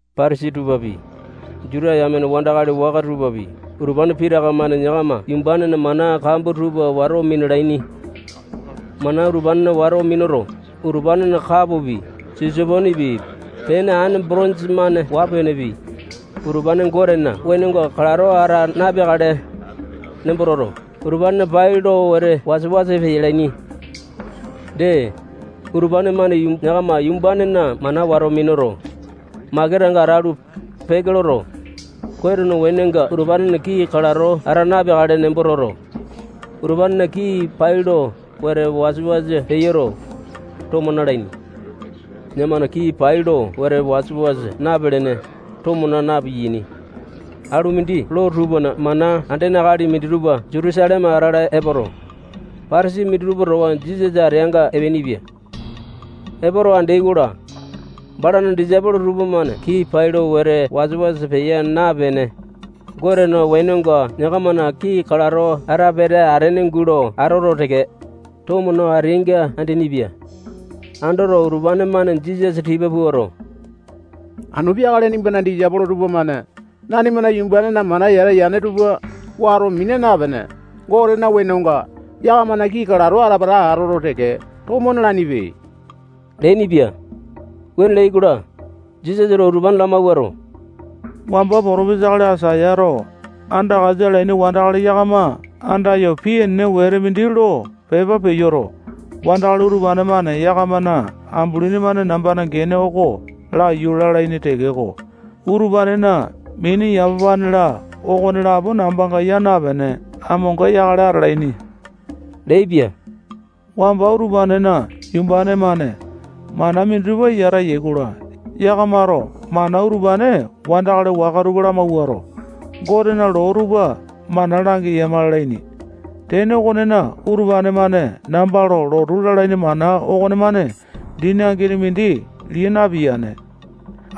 Patasai tupapi, Juta yame wandakali waka tupapi, utupane pitaka-mane yakama yumbanena mana kambua tupa wato minalaini. Mana utupane wato minuto, utupanena kapopi, siso-penepi, pene aene botonja-mane waa-penepi, utupane Gotena wenonga kalato ata napeakale nembo toto, utupane pai lo wete wasa-wasa peyalaini. Dee, utupane-mane yakama yumbanena mana wato minuto, makesanga atalu, peke loto, Gotena wenonga utupanena kii kalato ata napeakale nembo toto, utupanena kii pai lo wete wasa-wasa peyoto, tomo nalaini. Yakamana kii pai lo wete wasa-wasa napelene, tomo naa na-piyaini. Alu mindi loo tupana mana andene akali minditupa Jutusaleme atala epoto, Patasai minditupa towa Jisasa ateanga epeainipia. Epoto andeai-kola, balana disaipolo tupamane kii pai lo wete wasa-wasa peya napene, Gotena wenonga yakamana kii kalato ate peta atene gulo atoto teke, tomo no ateainga andeaini-pia. Andoto, utupane-mane Jisasa tipa puato, anu peakale nimbana disaipolo tupamane nanima yumbanena mana yata-ene tupa wato mina napene, Gotena wenonga yakamana kii kalato ate peta atoto teke, tomo nalainipe leainipia. Wuane leai-kola, Jisasato utupane lamawuato, wamba potopesa akali Aisayato andakasa alaini wandakali yakama andayo pii enene wete mindi lo pepa peyoto, wandakali utupane-mane yakamana ambulini-mane nambana gene oko laiyu lalaini tekeko, utupanena mini, yamapane-la, okonelapo nambanga yaa napene, amonga yakale atalaini leaipia. Wamba utupanena yumbane-mane mana minditupa yata yai-kola, yakamato mana utupane wandakali waka tupa lamawuato, Gotena loo tupa mana langeyama lalaini. Tene okonena, utupane-mane namba lo lotu lalaini mana okomane dini angini mindi lia napiyane.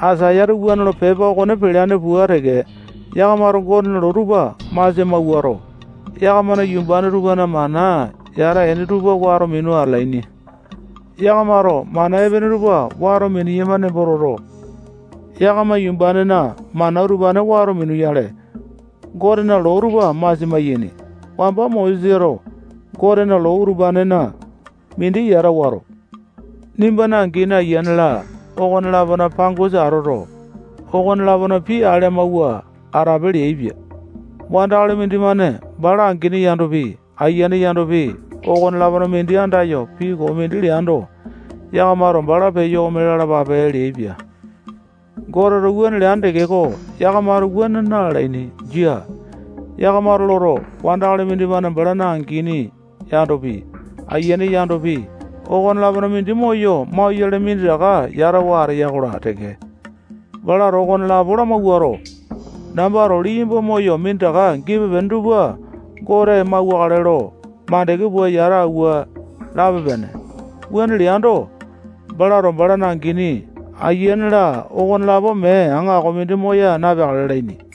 Aisayato wuane lo pepa okone peleane pua teke, yakamato Gotena loo tupa masia mawuato, yakamana yumbane tupana mana yata ene tupa wato minu atalaini. Yakamato mana epene tupa wato mineyama nembo toto, yakama yumbanena mana utupane wato minuyale, Gotena loo tupa masia maiyaini. Wamba Mosesato Gotena loo utupanena mindi yata wato, nimbana angini, ayiane-la, okone-lapona pangosa atoto, okone-lapona pii ale amawua atape leaipia. Wandakali mindimane bala angini yandopi, ayiane yandopi, okone-lapona mindi andayo pii koo mindi leando, yakamato bala peyo ome lalapape leaipia. Goteto wuane leane tekeko, yakamato wuane na-lalaini. Jia. Yakamato loto, wandakali mindimane balana angini yandopi, ayiane yandopi, okone-lapona mindi moyo maulane minditaka yatawa ateya-kola teke, balato okonelapo lamawuato, nambato liyamba moyo minditaka gipe-pene tupa Gote mauwakale lo mandeke pua yata auwa lape-pene. Wuane leando, balato balana angini, ayiane-la, okonelapo mee aŋakopi mindi moya napeakale lalaini.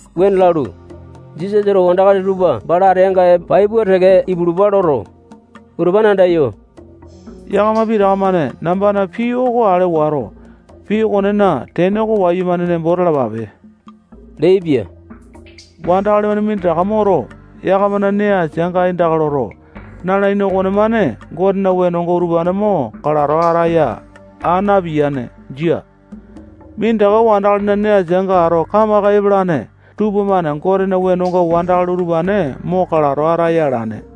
Wuane lalu, Jisasato wandakali tupa bala ateanga pai pua teke ipulupa loto, utupane andayo, yakama pitaka-mane nambana pii oko ale wato, pii okonena tene oko wayumane nembo talapape leaipia. Wandakali-mane minditaka moto, yakamana nee asianga aindaka loto, nalaini okomane Gotena wenonga utupane mo kalato ataya aa napiyane. Jia. Minditaka wandakalina nee asianga ato kamaka epalane tupamane Gotena wenonga wandakali utupane mo kalato ataya alane.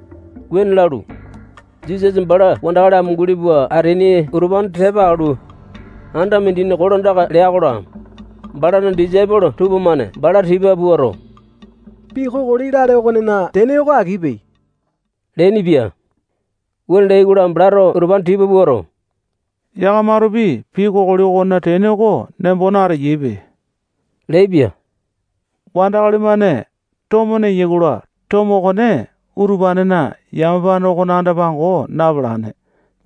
Wuane lalu, Jisasa bala wandakali amunguli pua ateaini utupane tepa alu, anda mindina kolandaka lea-kola, balana disaipolo tupamane bala tipa puato, pii kokoli lale okonena tene oko akipe leainipia. Wuane leai-kola, balato utupane tipa puato, yakamatopi pii kokoli okonena tene oko nembo nateyaipe leaipia. Wandakali-mane tomo neyai-kola, tomo okone utupanena yamapane okona anda-pango napalane.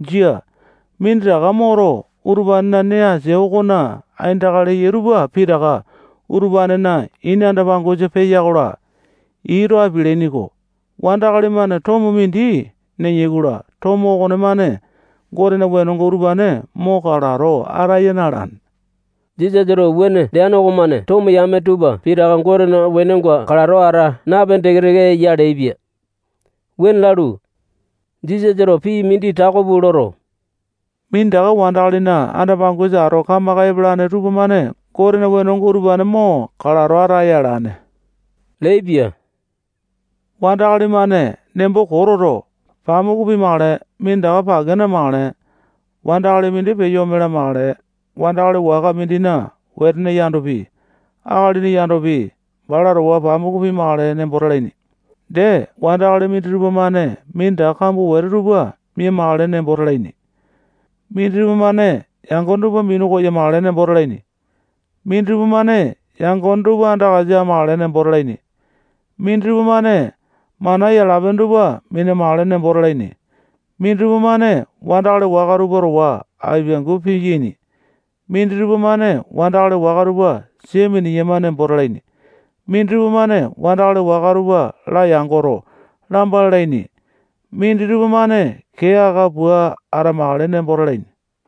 Jia. Minditaka moto, utupanena nee asia okona aindaka leyai tupa pitaka utupanena ini anda-pangosa peya-kola, ii too apialaini-ko. Wandakali-mane tomo mindi neya-kola, tomo okonemane Gotena wenonga utupane mo kalato ataya na-alane. Jisasato wuane leane okomane tomo yame tupa pitaka Gotena wenonga kalato ata napene teke-teke eya leaipia. Wuane lalu, Jisasato pii mindi tako pua loto, minditaka wandakalina anda-pangosa ato kamaka epalane tupamane Gotena wenonga utupane mo kalato ataya alane leaipia. Wandakali-mane nembo koo toto, pamuku pimakale, minditaka pake namakale, wandakali mindi peyo ome lamakale, wandakali waka mindina wetene yandopi, akalini yandopi, bala towa pamuku pimakale nembo talaini. Dee, wandakali minditupa-mane minditaka kambua wete tupa mia-makale nembo talaini. Minditupa-mane yangone tupa minu koyamakale nembo talaini. Minditupa-mane yangone tupa andakasa amakale nembo talaini. Minditupa-mane mana yala-pene tupa mina-makale nembo talaini. Minditupa-mane wandakali waka tupa towa apiangu piyaini. Minditupa-mane wandakali waka tupa sia mineyama nembo talaini. Minditupa-mane wandakali waka tupa layangoto, lamba lalaini. Minditupa-mane kee aka pua atamakale nembo talaini.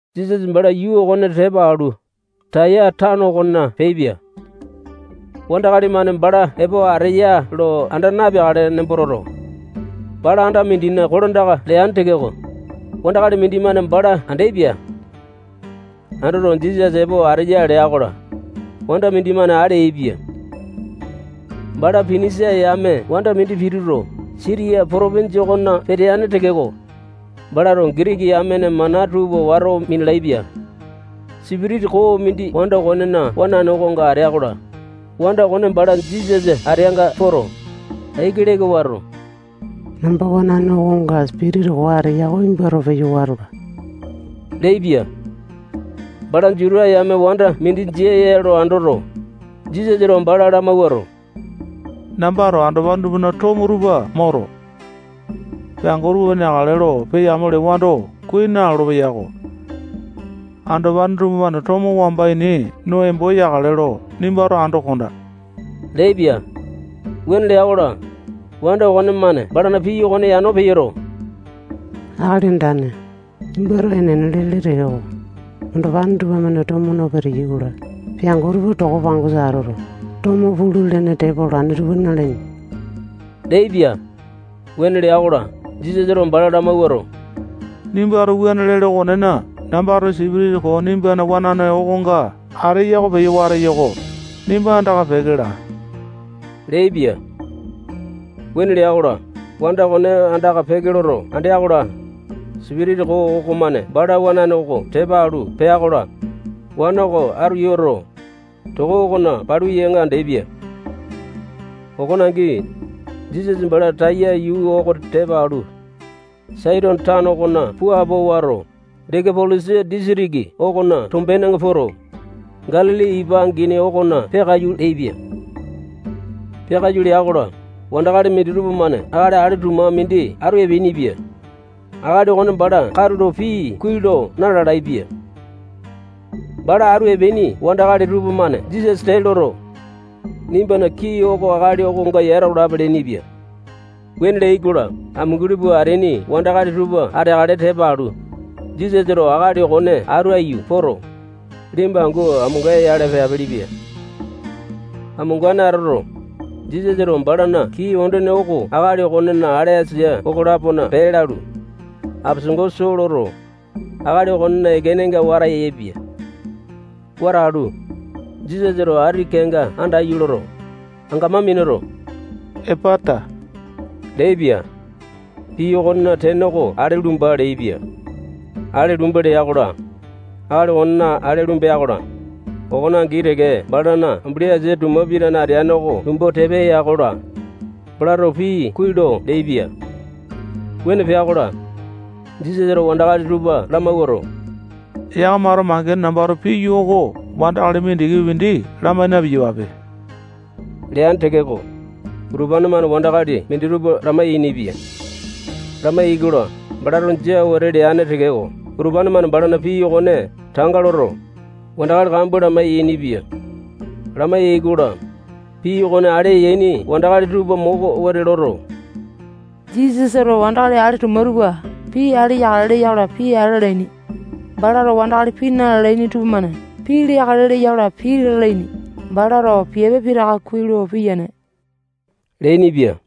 Jisasa bala yuu okone tepa alu, Taya tano okona peaipia. Wandakali-mane bala epo ateya lo anda napeakale nembo toto, bala anda mindina kolandaka leane tekeko, wandakali mindimane bala andeaipia. Andoto, Jisasa epo ateya lea-kola, wanda mindimane ale yaepia. Bala Pinisia yame wanda mindi pituto, Sitiya potopinja okona peteane tekeko, balato Gitiki yamena mana tupa wato minalaepia. Sipitisa koo mindi wanda okonena wanane okonga atea-kola, wanda okone bala Jisasa ateanga poto, aiki leka wato, namba wanane okonga sipitisa koo ateya oko nimbato peyo watola leaipia. Bala Juta yame wanda mindi jia ya lo andoto, Jisasato bala lamawuato, nambato andopane tupana tomo tupa moto, peango tupamane neakale lo peya-amo lewando, kuai nalolo-peyako. Andopane tupamane tomo wamba ini no embo yakale lo nimbato ando kondaa leaipia. Wuane lea-kola, wanda okonemane balana pii okone yano peyoto, Akali Andane, nimbato enene lele tekeko, andopane tupamane tomo no peteyai-kola, peango tupa toko pangosa atoto, tomo pulu-lene tepa olane tupa nalaini leaipia. Wuane lea-kola, Jisasato bala lamawuato, nimbato wuane lele okonena, nambato sipitisa koo nimbana wanane okonga ateya oko peyo wateyo-ko. Nimba andaka peke laa leaipia. Wuane lea-kola, wanda okone andaka peke loto andea-kola, sipitisa koo okomane bala wanane oko tepa alu pea-kola, wana oko atu yoto, toko okona palu yanga andeaipia. Okone angi, Jisasa bala Taya yuu oko tepa alu, Saitone tano okona puapo wato, Dekapolisa disitiki okona tombenenga poto, Galili ipa angini okona peakaiyu leaipia. Peakaiyu lea-kola, wandakali minditupa-mane akali ale tuma mindi atu epeainipia. Akali okone bala katulo pii kuai lo na-lalaepia. Bala atu epeaini wandakali tupamane Jisasa tee loto, nimbana kii oko akali okonga yata olape leainipia. Wuane leai-kola, amunguli pua ateaini wandakali tupa ateakale tepa alu, Jisasato akali okone atu aiyu poto, liyamba angu amonga-yale peapelepia. Amongane atoto, Jisasato balana kii ondene oko akali okonena ale asia okolapona pee lalu, apesango soo loto, akali okonena ekenenga wata yaepia. Wata alu, Jisasato ati kenga andaiyu loto, angamai minuto, epata leaipia. Pii okonena tene oko ale lumba leaipia. Ale lumba lea-kola, akali okonena ale lumbea-kola, okone angi teke balana ambuli asia tuma pitane ateane oko lumbu tepa ya-kola, balato pii kuai lo leaipia. Wuane pea-kola, Jisasato wandakali tupa lamawuato, yakamato mangene nambato piyo oko wandakali mindikipi mindi lamai na-piyapape leane tekeko, utupane-mane wandakali minditupa lamai-yainipia. Lamai-yaikola, balato jia wete leane tekeko, utupane-mane balana pii okone tanga loto, wandakali kambua lamai-yainipia. Lamai-yaikola, pii okone ale yaini wandakali tupa moko wete loto, Jisasato wandakali ale tuma tupa pii ale yakale leya-kola, ale alaini. Balato wandakali pii na-lalaini tupamane pii leakale leya-kola, pii ale alaini. Balato piape pitaka kuai lo piyane leainipia.